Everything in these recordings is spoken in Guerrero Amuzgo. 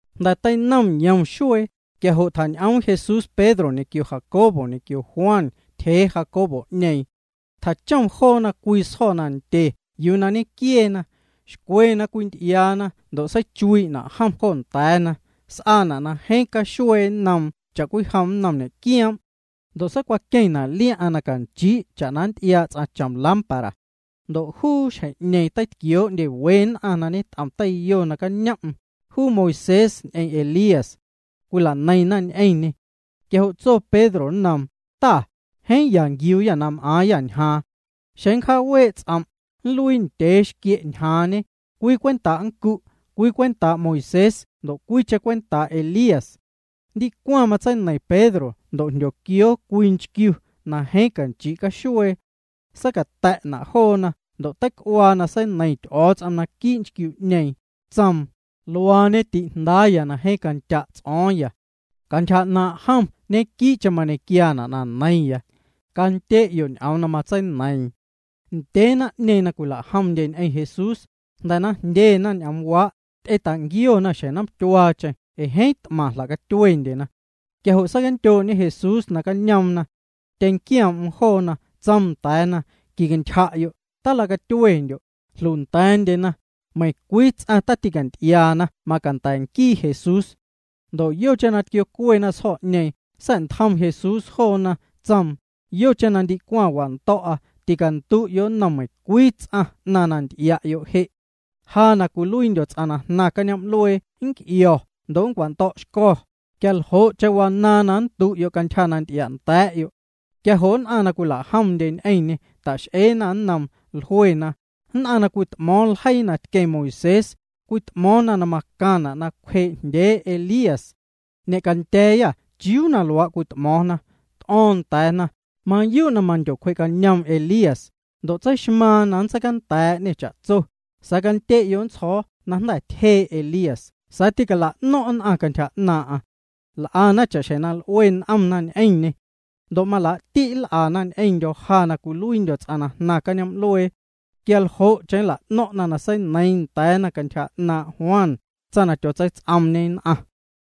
Jnda̱ teinom yom xuee, quia jo' tjañ'oom Jesús Pedro ñequio Jacobo ñequio Juan tyjee Jacobo'ñeeⁿ. Tjachom joona cwii sjo̱ nandye yuu na ñenquieena. Xcwe na cwinty'iaana ndo' seichuii'na' jom jo nda̱a̱na. S'aana' na jeeⁿ caxuee nnoom cha'cwijom nnom ñe'quioom'. Ndo' seicwaqueⁿna' liaⁿ'aⁿ na canchii' cha'na nnty'iaa' ts'aⁿ chom lámpara. Ndo' juu xjeⁿ'ñeeⁿ nacañom'm teitquioo'ndye we nn'aⁿ na ñet'om teiyo, juu Moisés ñ'eⁿ Elías. Cwila'neiⁿna ñ'eⁿñê. Quia jo' tso Pedro nnoom: —Ta, jeeⁿ ya nquiuuyâ na m'aaⁿyâ ñjaaⁿ. Xeⁿ cjaawee' ts'om', nluii ndyee xquie' ñjaaⁿñe, cwii cwenta' nncu', cwii cwentaa' Moisés ndo' cwiicheⁿ cwentaa' Elías. Ndicwaⁿ matseineiⁿ Pedro ndo' jndyoquioo cwii nchquiu na jeeⁿ canchii' caxuee juuna'. Seicata̱'na' joona ndo' teic'uaa na seineiⁿ Ty'o̱o̱ts'om naquii' nchquiu'ñeeⁿ, tsoom: —Luaañe ti'Jndaaya na jeeⁿ candya' ts'o̱o̱ⁿya. Cantyja 'naaⁿ' jom ñequii'cheⁿ mañequiaana' na neiⁿya. Candye'yo' ñ'oom na matseineiiⁿ. Ndyee naⁿ'ñeeⁿ na cwila'jomndye ñ'eⁿ Jesús, jnda̱ na jndyena ñ'oomwaa', ty'eta'nquiona xjeⁿ nomtyuaacheⁿ ee jeeⁿ t'maⁿ jla'catyuendyena. Quia jo' seicandyoo'ñe Jesús nacañoomna. Tyeⁿnquioom'm joona, tsoom nda̱a̱na: —Quicantyja'yo'. Talacatyuendyo'. Jlunda̱a̱ndyena. Meiⁿcwii ts'aⁿ tîcanty'iaana macanda̱ ñenquii Jesús. Ndo' yocheⁿ na tquiocuena sjo̱'ñeeⁿ, sa̱'ntjom Jesús joona, tsoom: —Yocheⁿ na ndicwaⁿ wando̱'a, ticandu'yo' nnom meiⁿcwii ts'aⁿ 'naⁿ na nty'ia'yo' je'. Ja na cwiluiindyo̱ ts'aⁿ na jnaⁿ cañoom'luee nnc'io̱ ndo' nncwando̱'xco̱, quia ljo'cheⁿ wanaaⁿ na nndu'yo' cantyja na nty'ianda̱a̱'yo'. Quia jo' nn'aⁿ na cwila'jomndye ñ'eⁿñê, ta'x'eena nnoom, jluena: —Nn'aⁿ na cwit'mo̱o̱ⁿ ljeii na tqueⁿ Moisés, cwit'mo̱o̱ⁿna na macaⁿna' na cwjee'jndyee Elías. Ñe'candya̱a̱yâ ¿chiuu na luaa' cwit'mo̱o̱ⁿna? T'o̱o̱ⁿ nda̱a̱na: —Mayuu' na mandyocwjee'cañoom Elías, ndo' tseixmaaⁿ na nntseijndaa'ñê cha'tso, sa̱a̱ candye'yo' nntsjo̱o̱ na jnda̱ tyjee' Elías sa̱a̱ tîcala'no̱ⁿ' nn'aⁿ cantyja 'naaⁿ'aⁿ. L'ana cha'xjeⁿ na l'ue n'omna ñ'eⁿñê. Ndo' malaa'ti' nl'ana ñ'eⁿndyo̱ ja na cwiluiindyo̱ ts'aⁿ na jnaⁿ cañoom'luee. Quia ljo'cheⁿ jla'no̱ⁿ'na na seineiiⁿ nda̱a̱na cantyja 'naaⁿ' Juan, tsaⁿ na tyotseits'oomñe nn'aⁿ.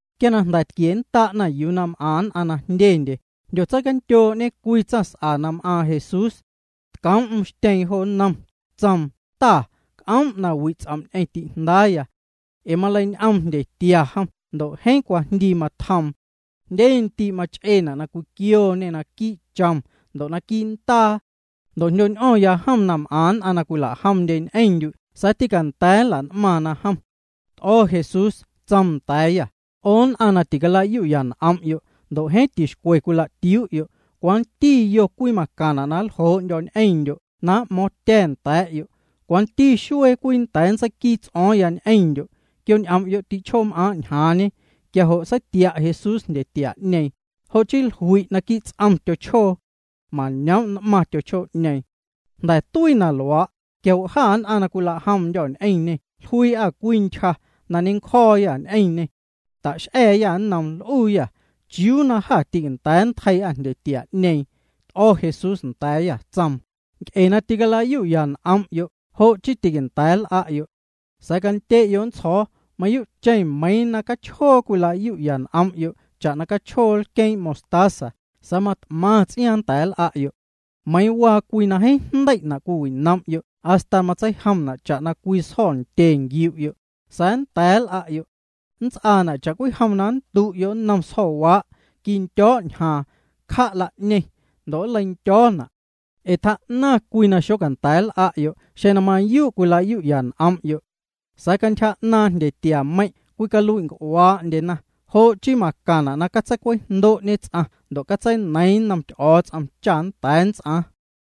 Quia na jnda̱ tquiennda'na yuu na m'aⁿ nn'aⁿ na jndyendye, jndyotseicandyoo'ñe cwii tsaⁿs'a na m'aaⁿ Jesús. Tcoom'm xtyeeⁿ jo nnom, tsoom: —Ta, c'oom' na wi' ts'om' ñ'eⁿ ti'jndaaya. Ee maleiñ'oom jndyetia jom ndo' jeeⁿ cwajndii matjoom. Jndye ndii' mach'eena' na cwiquiooñê naquii' chom ndo' naquii' ndaa. Ndo' jndyo̱ñ'o̱ⁿya jom na m'aⁿ nn'aⁿ na cwila'jomndye ñ'eⁿndyu' sa̱a̱ tileicanda̱a̱ na nla'n'maⁿna jom. T'o̱ Jesús, tsoom nda̱a̱yâ: —'O nn'aⁿ na ticalayu'ya n'om'yo', ndo' jeeⁿ tixcwe cwila'tiuu'yo', ¿cwanti yo cwii macaⁿna' na nljoo'ndyo̱ ñ'eⁿndyo' na m'mo̱o̱ⁿtya̱ nda̱a̱'yo'? ¿Cwanti xuee cwii nnda̱a̱ nntseiquii ts'o̱o̱ⁿya ñ'eⁿndyo'? Quioñ'om'yo' ti'chjoom'aaⁿ' ñjaaⁿñe. Quia jo' seitia' Jesús jndyetia'ñeeⁿ, jo' chii jlui' naquii' ts'om tyochjoo. Mañoom' n'maⁿ juu. Jnda̱ tuii na luaa', quia jo' jâ nn'aⁿ na cwila'jomndyô̱ ñ'eⁿñê jluii'â cwii ntyja na ñencjo̱o̱yâ ñ'eⁿñê. Ta'x'a̱a̱yâ nnoom, l'uuyâ: —¿Chiuu na jâ tîcanda̱a̱ nntjeii'â jndyetia'ñeeⁿ? T'o̱ Jesús nda̱a̱yâ, tsoom: —Nc'e na ticala'yu'ya n'om'yo' jo' chii tîcanda̱a̱ l'a'yo'. Sa̱a̱ candye'yo' nntsjo̱o̱, mayuu'cheⁿ meiiⁿ na cachjoo cwilayu'ya n'om'yo' cha'na cachjoo lqueeⁿ' mostaza sa̱a̱ mat'maⁿ ts'iaaⁿ nnda̱a̱ nl'a'yo'. Meiiⁿ waa cwii na jeeⁿ jndei'na' cwiwinom'yo' hasta matseijomna' cha'na cwii sjo̱ndye nquiu'yo', sa̱a̱ nnda̱a̱ nl'a'yo'. Nnts'aana' cha'cwijom na nndu'yo' nnom sjo̱waa': “Quindyo̱' ñjaaⁿ, cja' la'ñeⁿ”, ndo' nleindyo̱o̱na'. Ee tjaa'naⁿ cwii na xocanda̱a̱ nl'a'yo' xeⁿ na mayuu' cwilayu'ya n'om'yo'. Sa̱a̱ cantyja 'naaⁿ' jndyetiameiⁿ' cwicalui'nc'uaa'ndyena, jo' chii macaⁿna' na catseicwejndo'ñe ts'aⁿ ndo' catseineiiⁿ nnom Ty'o̱o̱ts'om cha nnda̱a̱ nnts'aaⁿ.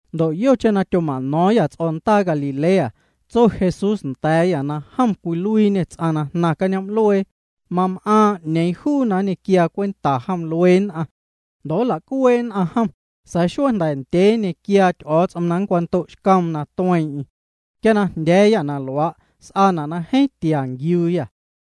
Ndo' yocheⁿ na tyoma'no̱o̱ⁿyâ ts'o̱ndaa Galilea, tso Jesús nda̱a̱yâ na jom na cwiluiiñê ts'aⁿ na jnaⁿ cañoom'luee, mam'aaⁿ 'ñeeⁿ juu na nñequiaa cwenta jom luee nn'aⁿ. Ndo' nla'cuee' nn'aⁿ jom, sa̱a̱ xuee jnda̱ ndyee nñequiaa Ty'o̱o̱ts'om na nncwando'xcoom na tueeⁿ'eⁿ. Quia na jndya̱a̱yâ na luaa', s'aana' na jeeⁿ tia nquiuuyâ.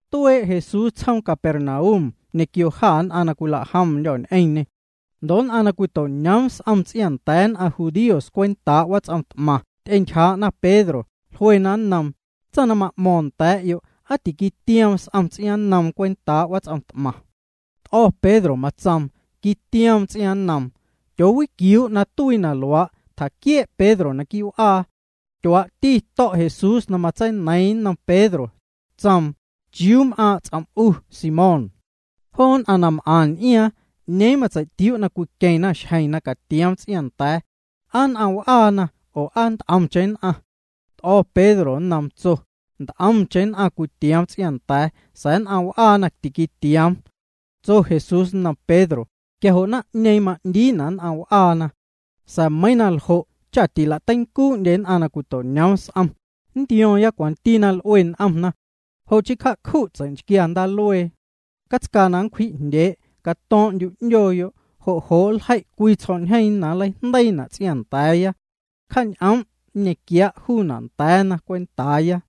Tuee' Jesús tsjoom Capernaum ñequio jâ nn'aⁿ na cwila'jomndyô̱ ñ'eⁿñê. Ndo' nn'aⁿ na cwito'ñoom s'om ts'iaaⁿnda̱a̱ nn'aⁿ judíos cwentaa' wats'om t'maⁿ ty'entyjaa'na Pedro, jluena nnoom: —Tsaⁿ na ma'mo̱ⁿ nda̱a̱'yo', ¿aa tiquitioom s'om ts'iaaⁿnnoom cwentaa' wats'om t'maⁿ? T'o̱ Pedro, matsoom: —Quitioom ts'iaaⁿnnoom. Tyoowiquiuu' na tuii na luaa', tjaquiee' Pedro quii' w'aa. Tyuaa'ti to̱' Jesús na matseineiiⁿ nnom Pedro. Tsoom: —¿Chiuu m'aaⁿ' ts'om' 'u, Simón? Joo nn'aⁿ na m'aⁿ n'iaaⁿ, ¿'ñeeⁿ matsei'tiuu' na cwiqueⁿna xjeⁿ na catioom ts'iaaⁿnda̱a̱? ¿Aa nn'aⁿ w'aana oo aa nt'omcheⁿ nn'aⁿ? T'o̱ Pedro nnoom, tso: —Nt'omcheⁿ nn'aⁿ cwitioom ts'iaaⁿnda̱a̱, sa̱a̱ nn'aⁿ w'aana tiquitioom. Tso Jesús nnom Pedro: —Quia jo' naⁿ'ñeeⁿ ma'ndiina' nn'aⁿ w'aana. Sa̱a̱ meiiⁿ na ljo' cha tila'teincuu'ndye nn'aⁿ na cwito'ñoom s'om, nntio̱o̱ⁿya cwanti na l'ue n'omna. Jo' chii cja'cju' tsei'nchquia ndaaluee. Catscaa na nncwji'jndyee', cato̱o̱ⁿ'ndyu' 'ndyooyo', jo' jo' nljei' cwii tsjo̱'ñjeeⁿ na nleijndeiina' ts'iaaⁿnda̱a̱ya. Cja'ñ'oom', nñequiaa' juuna' nda̱a̱na cwentaaya.